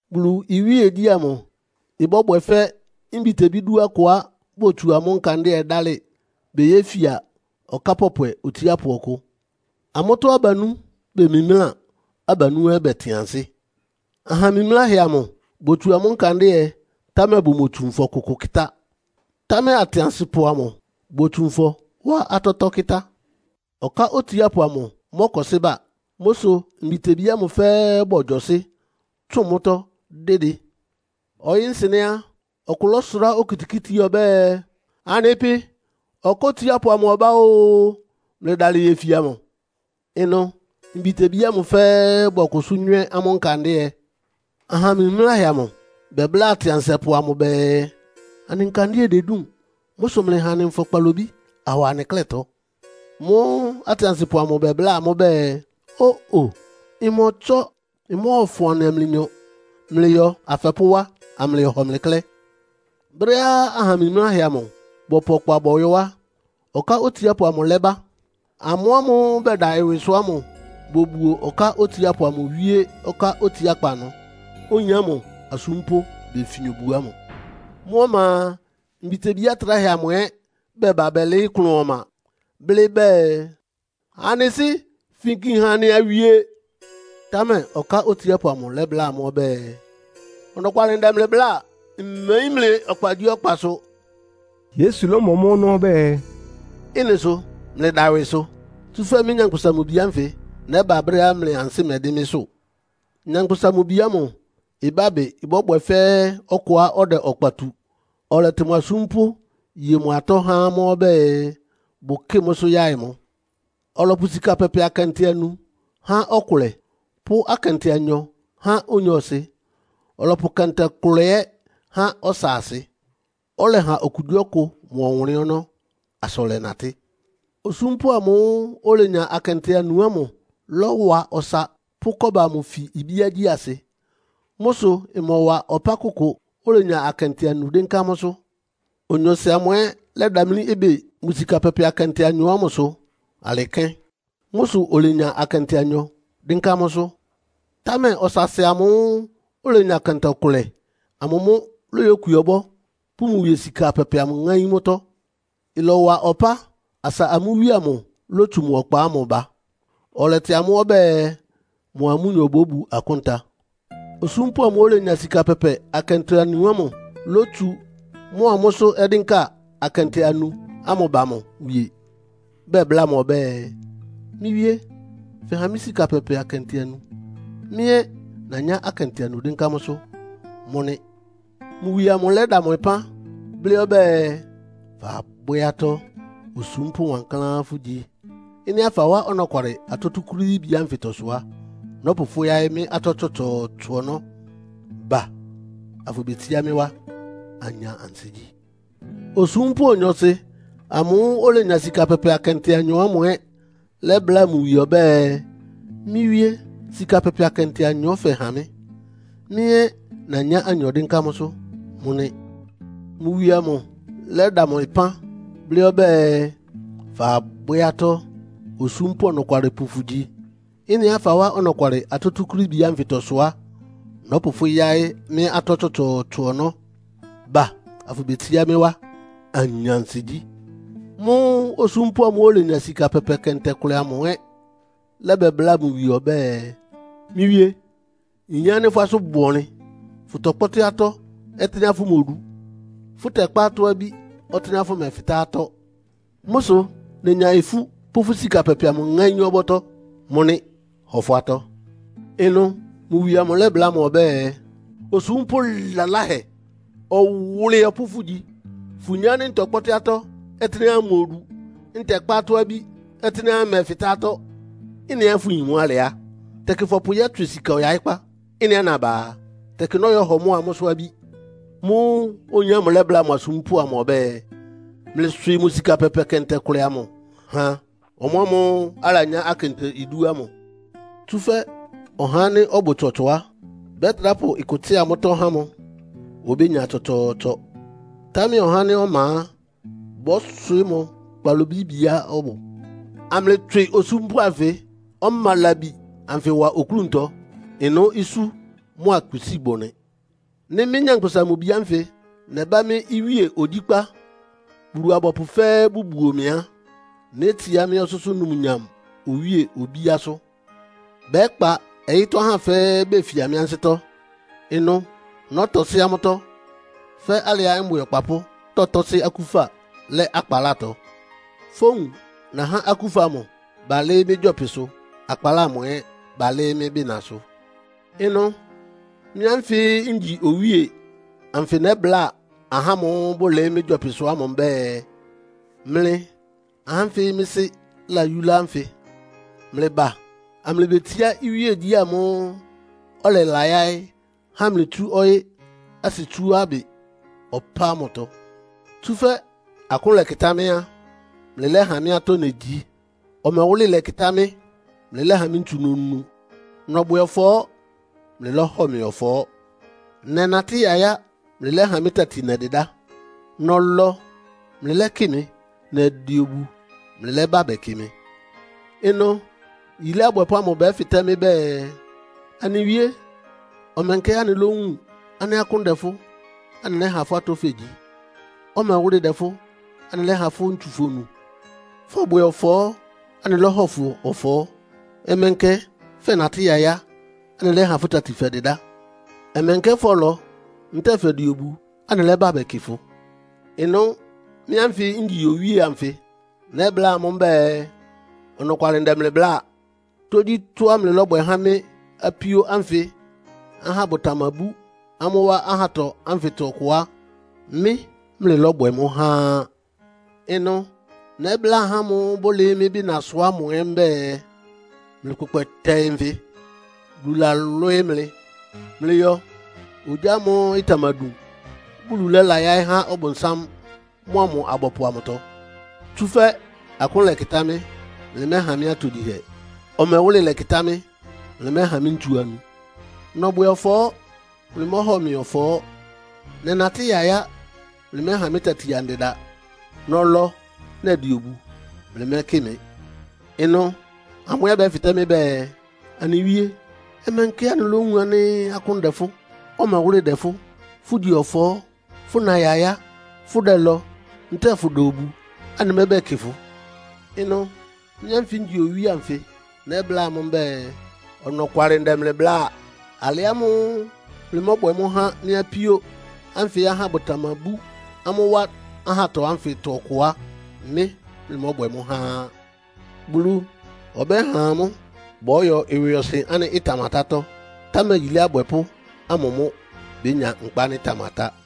“Bulu iwíegyí ámʋ ɩbɔ́bwɛ fɛ́ mbitebí dú akʋá botsu amʋ́ nkandɩ́ɛ dálɩ beyéfia ɔká pɔpwɛ otsiápʋ ɔkʋ. Amʋ́tɔ́ abanú bemimláa, abanú ɛ́ bɛtɩn ansɩ́. Aha mimláhɛ amʋ botsu amʋ́ nkandɩ́ɛ, támɛ bʋmotsu nfɔ kʋkʋ kɩ́tá. Támɛ atɩansɩpʋ amʋ botsu nfɔ wá atɔ́tɔ́ kɩ́tá. Ɔká otsiápʋ amʋ mɔ́kɔsɩ́ ba. Mʋ́ sʋ mbitebí ámʋ fɛ́ɛ́ bɔgyɔsɩ́, tsʋn mʋ́tɔ́ dɩ́dɩ. “Ɔyɩ́-nsɩnɛ́ á, ɔkʋ lɔ́sʋrá okitikíti ɔbɛ́ɛ, ‘Anɩ pɩ, ɔká otsiápʋ amʋ ɔbá o! Mlɩdalɩ yefia mʋ!’ Ɩnʋ mbitebí ámʋ fɛ́ɛ́ bɔkʋsʋ́ nywɛ́ amʋ́ nkandɩ́ɛ. Aha mimláhɛ amʋ bɛbláa atɩansɩpʋ amʋ bɛɛ, ‘Anɩ nkandɩ́ɛ dedúun. Mʋ́ sʋ mlɩha anɩ nfɔ kpalobí awa anɩ klɛ́tɔ.’ Mʋ́ʋ́ atɩansɩpʋ amʋ bɛbláa amʋ́ bɛɛ, ‘Ó-o, ɩmɔtsɔ́. Ɩmɔ́ɔfʋn anɩa mlɩnyɔ. Mlɩyɔ afɛpʋ́ wá, amlɩyɔhɔ mlɩ klɛ́.’ Brɛ́á aha mimláhɛ amʋ bɔpʋ ɔkpa bɔyɔ́ á, ɔká otsiápʋ amʋ lɛ́ba. Amʋ́ ámʋ́ʋ́ bɛda ɩwɩsʋ ámʋ bobuo ɔká otsiápʋ amʋ wíé ɔká otsiákpá ɩnʋ, oyin ámʋ asúmpʋ́ befin obu ámʋ. “Mʋ́ ɔma a, mbitebí atráhɛ amʋ ɛ́ bɛba bɛlɩɩ́ klʋn ɔma, blɩ́ bɛɛ, ‘Anɩ sɩ́, finki ha anɩ awie.’ Támɛ ɔká otsiápʋ amʋ lɛ́bláa amʋ́ ɔbɛ́ɛ, ‘Ɔnɔkwalɩ ndɛ mlɩ bláa, mmeyín mlɩ ɔkpagyíɔkpasʋ.’” Yesu lɔ́mɔ mʋ́ ɔnɔ́ ɔbɛ́ɛ, “Ɩ́nɩ sʋ mlɩda ɩwɩsʋ, tsúfɛ́ mɩ́, Nyankpʋsa-Mʋ-Bi ánfɩ nɛ́ba brɛ́á mlɩ ansɩ́ mɛdɩ́n mɩ́sʋ́. “Nyankpʋsa-Mʋ-Bi ámʋ ɩbábɩ bɔ́bwɛ fɛ́ ɔkʋá ɔdɛ ɔkpa tu, ɔlɛtɩ mʋ asúmpʋ́, ye mʋ atɔ́ há amʋ́ ɔbɛ́ɛ, bʋkɩ́ɩ mʋ́sʋ́ yaɩ mʋ. Ɔlɔpʋ sika pɛpɛ akɛntɛ anu há ɔkʋlɛ, pʋ́ akɛntɛ anyɔ há onyɔɔsɩ, ɔlɔpʋ kɛntɛ kʋlɛ ɛ́ há ɔsaasɩ. Ɔlɛha okugyíɔkʋ mʋ ɔwʋnlɩ́n ɔnɔ́ asa ɔlɛnatɩ́. Osúmpʋ́ ámʋ́ʋ́ olenya akɛntɛ anu ámʋ lɔ́wa ɔsa pʋ́ kɔ́ba amʋ fi ibíágyí asɩ. Mʋ́ sʋ ɩmɔwa ɔpá kʋkʋ, olenya akɛntɛ anu dɩ́nká mʋ́sʋ́. Onyɔɔsɩ amʋ ɛ́ lɛ́damlí ɩbɩ mʋ sika pɛpɛ akɛntɛ anyɔ ámʋsʋ alɩ kɛ́n. Mʋ́ sʋ olenya akɛntɛ anyɔ dɩ́nká mʋ́sʋ́. Támɛ ɔsaasɩ amʋ́ʋ́ olenya kɛntɛ kʋlɛ amʋ mʋ́ lóyókwi ɔbɔ́, pʋ́ mʋ wie sika pɛpɛ amʋ ŋáín mʋ́tɔ́. “Ɩlɔwa ɔpá asa amʋ́ wíe amʋ lótsu mʋ ɔkpa ámʋ ba, ɔlɛtɩ amʋ́ ɔbɛ́ɛ, mʋa amʋ́nyɔ bóbu akúnta. Osúmpʋ́ ámʋ́ʋ́ olenya sika pɛpɛ akɛntɛ anu ámʋ lótsu mʋ́a mʋ́sʋ́ ɔdɩ́nka akɛntɛ anu ámʋ ba mʋ wie, bɛbláa mʋ ɔbɛ́ɛ, ‘Mɩ́ wíé, fɛha mɩ́ sika pɛpɛ akɛntɛ anu. Mɩ́ ɛ́ nanyá akɛntɛ anu dɩ́nká mʋ́sʋ́. Mʋ́ nɩ́.’ Mʋ wie amʋ lɛ́da mʋ ɩpán, blɩ́ ɔbɛ́ɛ, ‘Fabwɛ́ atɔ́. Osúmpʋ́ wankláán fʋ́gyi. Ɩ́nɩá fawá ɔnɔkwalɩ atɔ́ túkúrííbi ánfɩtɔ sʋ á, nɔ́pʋ fʋ́ yáɩ́ mɩ́ atɔ́ tsɔtsɔɔtsɔ ɔnɔ́. Ba afʋbetsiá mɩ́ wá, anya ansigyí.’ “Osúmpʋ́ onyɔɔsɩ amʋ́ʋ́ olenya sika pɛpɛ akɛntɛ anyɔ ámʋ ɛ́ lɛ́bláa mʋ wie ɔbɛ́ɛ, ‘Mɩ́ wíé, sika pɛpɛ akɛntɛ anyɔ fɛha mɩ́. Mɩ́ ɛ́ nanyá anyɔ dɩ́nká mʋ́sʋ́. Mʋ́ nɩ́.’ Mʋ wie amʋ lɛ́da mʋ ɩpán, blɩ́ ɔbɛ́ɛ, ‘Fabwɛ́ atɔ́. Osúmpʋ́ ɔnɔkwalɩpʋ fʋgyi. Ɩ́nɩá fawá ɔnɔkwalɩ atɔ́ túkúrííbi ánfɩtɔ sʋ á, nɔ́pʋ fʋ́ yáɩ́ mɩ́ atɔ́ tsɔtsɔɔtsɔ ɔnɔ́. Ba afʋbetsiá mɩ́ wá, anya ansigyí.’ “Mʋ́ʋ́ osúmpʋ́ amʋ́ʋ́ olenya sika pɛpɛ kɛntɛ kʋlɛ amʋ ɛ́ lɛ́bɛbláa mʋ wie ɔbɛ́ɛ, ‘Mɩ́ wíé, nyin ánɩ́ fʋ́ asʋ́n bʋ ɔnlɩn. Fʋtɔkpɔ́tɩ́ atɔ́ ɔtɩ́nɛ́á fʋmodu; fʋtɛkpá atɔ́-abí ɔtɩ́nɛ́á fʋmɛfɩtá. Mʋ́ sʋ nenya ifú pʋ́ fʋ́ sika pɛpɛ amʋ ŋáín ɔbɔ́tɔ́. Mʋ́ nɩ́, hɔ fʋ́ atɔ́.’ “Ɩnʋ mʋ wie amʋ lɛ́bláa mʋ ɔbɛ́ɛ, ‘Osúmpʋ́ laláhɛ, ɔwʋlɩyɔpʋ́ fʋ́gyi. Fʋyin ánɩ́ ntɔkpɔ́tɩ́ atɔ́ ɔtɩ́nɛ́á mmodu, ntɛkpá atɔ́-abí ɔtɩ́nɛ́á mmɛfɩtá atɔ́. Ɩ́nɩá fʋyin mʋ́ alɩ á, tɛkɩ fɔpʋ yɔ́tswɩ sika ɔyaɩ́kpá. Ɩ́nɩá naba a, tɛkɩ nɔ́yɔhɔ mʋ́a mʋ́sʋ́ abí.’ Mʋ́ʋ́ oyin ámʋ lɛ́bláa mʋ asúmpʋ́ amʋ ɔbɛ́ɛ, ‘Mlɩswɩɩ mʋ sika pɛpɛ kɛntɛ kʋlɛ amʋ ha ɔmʋamʋ́ʋ́ alanyá akɛntɛ idú ámʋ. Tsúfɛ́ ɔhá ánɩ́ ɔbʋ tsɔtsɔ á, bɛtrá pʋ ɩkʋ tsɩ́a mʋ́tɔ́ há mʋ, obénya tsɔtsɔɔtsɔ. Támɛ ɔhá ánɩ́ ɔma á, bɔ́swɩɩ́ mʋ kpalobíbiá ɔbʋ, amlɩtswɩ osúmpʋ́ anfɩ́ ɔma labi ánfɩ wa oklúntɔ. Ɩnʋ́ isú mʋ́a kpisíi bʋ nɩ.’ “Nɩ́ mɩ́, Nyankpʋsa-Mʋ-Bi ánfɩ nɛbá mɩ́ iwíe ogyíkpá, Bulu-abɔpʋ fɛ́ɛ́ bʋbuo mɩ á, nétsiá mɩ́ ɔsʋ́sʋ́ numnyam owíe obíásʋ́. Bɛ́kpa ɔyɩ́tɔ́ ahá fɛ́ɛ́ befia mɩ́ ansɩ́tɔ́. Ɩnʋ nɔ́tɔsɩ́ amʋ́tɔ́, fɛ́ alɩá mbwɩ ɔkpapʋ́ tɔtɔ́sɩ́ akúfa lɛ́ akpalátɔ. Fówun nahá akúfa amʋ balɩ́ɩ́ mɩ́ gyɔpɩsʋ, akpaláa amʋ ɛ́ balɩ́ɩ́ mɩ́ bɩnasʋ. Ɩnʋ mɩ́ ánfɩ ngyi Owíe anfɩ nɛ́bláa ahá ámʋ́ʋ́ bʋlɩɩ́ mɩ́ gyɔpɩsʋ ámʋ mbɛ́ɛ, ‘Mlɩ ahá ánfɩ mɩ́ Sɩ́ layúlá ánfɩ mlɩba, amlɩbetsiá iwíegyí ámʋ́ʋ́ ɔlɛlayáɩ́ há mlɩ tsú ɔyɩ́ asɩtsuábɩ ɔpá ámʋtɔ. Tsúfɛ́ akʋ́n lɛkɩtá mɩ́ á, mlɩlɛ́ha mɩ́ atɔ́ negyi. Ɔmɛwʋ́lɩ lɛkɩtá mɩ́, mlɩlɛ́ha mɩ́ ntsu nonu. Nɔbwɛ ɔfɔɔ́, mlɩlɔ́hɔ mɩ ɔfɔɔ́. Nɛnatɩ́ yayá, mlɩlɛ́ha mɩ́ tati nɛdɩdá. Nɔlɔ, mlɩlɛ́kɩ mɩ. Nɛdɩ obu, mlɩlɛ́bá bɛkɩ mɩ.’ “Ɩnʋ yilé abwɛpʋ́ ámʋ bɛ́fɩtɛ́ mɩ́ bɛɛ, ‘Anɩ Wíé, ɔmɛnkɛ anɩlówun ánɩ́ akʋ́n dɛ fʋ́, anɩlɛ́ha fʋ́ atɔ́ fegyi? Ɔmɛwʋ́lɩ dɛ fʋ́, anɩlɛ́ha fʋ́ ntsu fonu? Fɔbwɛ ɔfɔɔ́, anɩlɔ́hɔ fʋ ɔfɔɔ́? Ɔmɛnkɛ fɛnatɩ́ yayá, anɩlɛ́ha fʋ́ tati fɛdɩdá? Ɔmɛnkɛ fɔlɔ, ntɛ́ɛ fɛdɩ obu, anɩlɛ́bá bɛkɩ fʋ?’ “Ɩnʋ mɩ́ ánfɩ ngyi Owíe ánfɩ nɛ́bláa amʋ́ mbɛ́ɛ, ‘Ɔnɔkwalɩ ndɛ mlɩ bláa. Tógyítɔ́á mlɩlɔ́bwɛ há mɩ́ apíó ánfɩ ahá bʋtamabú amʋ́ wá ahátɔ ánfɩtɔ ɔkʋ á, mɩ́ mlɩlɔ́bwɛ mʋ́ há á.’ “Ɩnʋ nɛ́bláa ahá ámʋ́ʋ́ bʋlɩɩ́ mɩ́ bɩnasʋ ámʋ ɛ́ mbɛ́ɛ, ‘Mlɩkpʋkpɛ tɛɩ nfɩ. Bulu lalwɩ́ɩ́ mlɩ. Mlɩyɔ ogyá ámʋ́ʋ́ ɩtamadun, Bulu lɛ́layáɩ́ há Ɔbʋnsám mʋ́a mʋ abɔpʋ amʋtɔ. Tsúfɛ́ akʋ́n lɛkɩtá mɩ́, mlɩmɛ́ha mɩ́ atogyihɛ. Ɔmɛwʋ́lɩ lɛkɩtá mɩ́, mlɩmɛ́ha mɩ́ ntsu annu. Nɔbwɛ ɔfɔɔ́, mlɩmɔ́hɔ mɩ ɔfɔɔ́. Nɛnatɩ́ yayá, mlɩmɛ́ha mɩ́ tati andɩda. Nɔlɔ, nɛdɩ obu; mlɩmɛ́kɩ mɩ.’ “Ɩnʋ amʋ́ ɛ́ bɛ́fɩtɛ́ mɩ́ bɛɛ, ‘Anɩ Wíé, ɔmɛnkɛ anɩlówun ánɩ́ akʋ́n dɛ fʋ́, ɔmɛwʋ́lɩ dɛ fʋ́, fʋgyi ɔfɔɔ́, fʋna yayá, fʋdɛlɔ ntɛ́ɛ fʋda obu; anɩmɛ́bɛkɩ fʋ?’ Ɩnʋ mɩ́ ánfɩ ngyi Owíe anfɩ nɛ́bláa amʋ́ mbɛ́ɛ, ‘Ɔnɔkwalɩ ndɛ mlɩ bláa. Alɩ ámʋ́ʋ́ mlɩmɔ́bwɛ mʋ́ há mɩ́ apíó ánfɩ ahá bʋtamabú amʋ́ wá ahátɔ ánfɩtɔ ɔkʋ á, mɩ́ mlɩmɔ́bwɛ há á.’ Bulu ɔbɛ́ha amʋ́ bɔ́yɔ ɩwɩɔsɩn ánɩ́ ɩtamatátɔ́, támɛ yilé abwɛpʋ́ ámʋ mʋ́ bénya nkpa ánɩ́ ɩtamatá.”